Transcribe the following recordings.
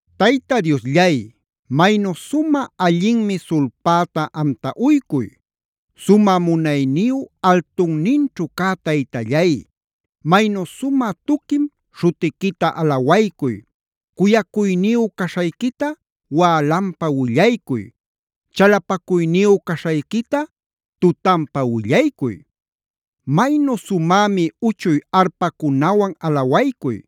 Tayta Diosllay, maynu sumä allinmi sulpäta amta uycuy. Sumä munayniyu altunninćhu cä Taytallay, maynu sumä tuquim śhutiquita alawaycuy, cuyacuyniyu caśhayquita wälanpa willaycuy, chalapacuyniyu caśhayquita tutanpa willaycuy. Maynu sumämi uchuy arpacunawan alawaycuy.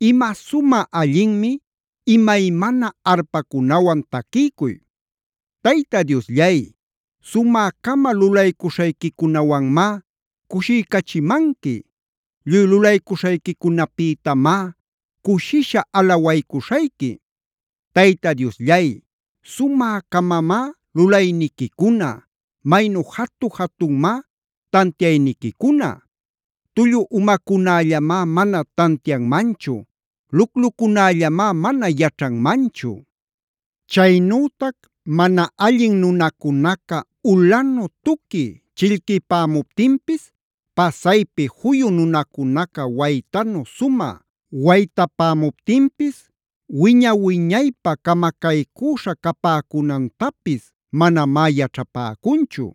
Ima sumä allinmi imaymana arpacunawan taquiycuy. Tayta Diosllay, sumä-cama lulaycuśhayquicunäwanmá cushiycachimanqui. Lluy lulaycuśhayquicunäpïtamá cushisha alawaycuśhayqui. Tayta Diosllay, ¡sumä-camamá lulayniquicuna! ¡Maynu jatu-jatunmá tantiayniquicuna! Tullu umacunällamá mana tantianmanchu. Luclucunällamá mana yaćhanmanchu. Chaynütac mana allin nunacunaca ulanu tuqui chillquipämuptinpis, pasaypi juyu nunacunaca waytanu sumä waytapämuptinpis wiña-wiñaypä camacaycüśha capäcunantapis manamá yaćhapäcunchu.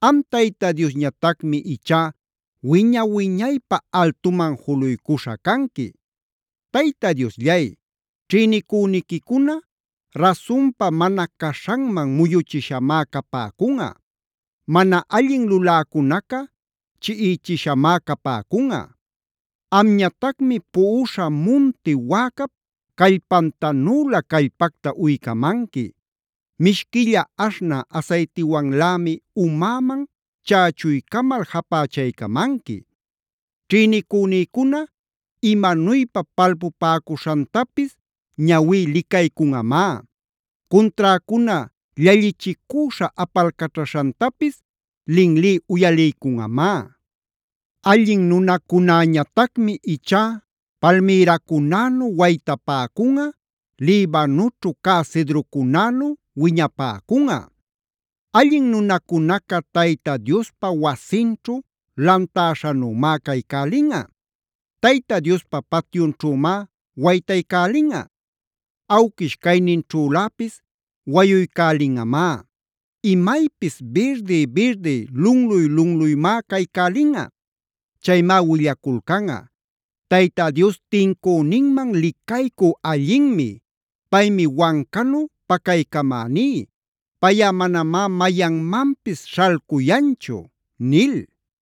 Am Tayta Diosñatacmi ichá wiña-wiñaypä altuman juluycuśha canqui. Tayta Diosllay, ćhïnicüniquicuna rasunpa mana caśhanman muyuchishamá capäcunꞌa. Mana allin luläcunaca chiꞌichishamá capäcunꞌa. Amñatacmi puꞌuśha munti wäcap callpantanülä callpacta uycamanqui. Mishquilla aśhnä asaytiwanlämi umäman chächuycamal japächaycamanqui. Ćhïnicünïcuna imanuypa palpupäcuśhantapis ñawí licaycunꞌamá. Cunträcuna llallichicüśha apalcaćhaśhantapis linlí uyaliycunꞌamá. Allin nunacunäñatacmi ichá palmïracunänu waytapäcunꞌa, Libanoćhu cä cedrocunänu wiñapäcunꞌa. Allin nunacunaca Tayta Diospa wasinćhu lantäśhanümá caycälinꞌa. Tayta Diospa patyunćhümá waytaycälinꞌa. Awquish cayninćhüläpis wayuycälinꞌamá. Imaypis birdiy-birdiy, lunluy-lunluymá caycälinꞌa. Chaymá willaculcanꞌa: “Tayta Dios tincüninman licaycü allinmi. Paymi wancanu pacaycamäní, payꞌa manamá mayanmanpis śhalcuyanchu” nil.